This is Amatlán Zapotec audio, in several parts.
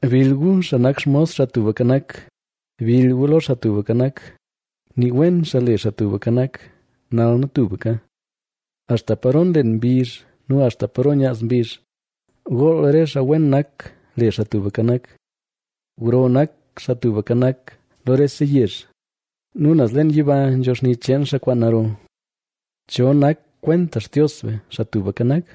Bill gu, xaa nak xmos Xaa Tubka Nak, bill gu lo Xaa Tubka Nak, Nii wen xaa le Xaa Tubka Nak, nal nu tubka. Axta paro nlen mbizh nu axta paro nyaaz mbizh, gool re xaa wen nak le Xaa Tubka Nak. Gro nak Xaa Tubka Nak lo rese yezh nu naz leen yiba nzho xni cheen xaa kwaan naro. ¿Cho nak kwenta Xtios be, Xaa Tubka Nak?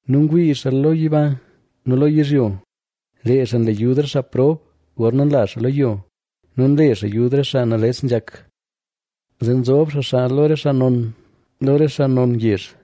nu ngwii xaa lo yiba nu lo yizhyo. Lee xaa nle yud re xaa prob, gorna nla xaa lo yo nu nle xaa yud re xaa nales nzhak. Zee nzob xaa xaa lo re xaa non, lo re xaa non yezh.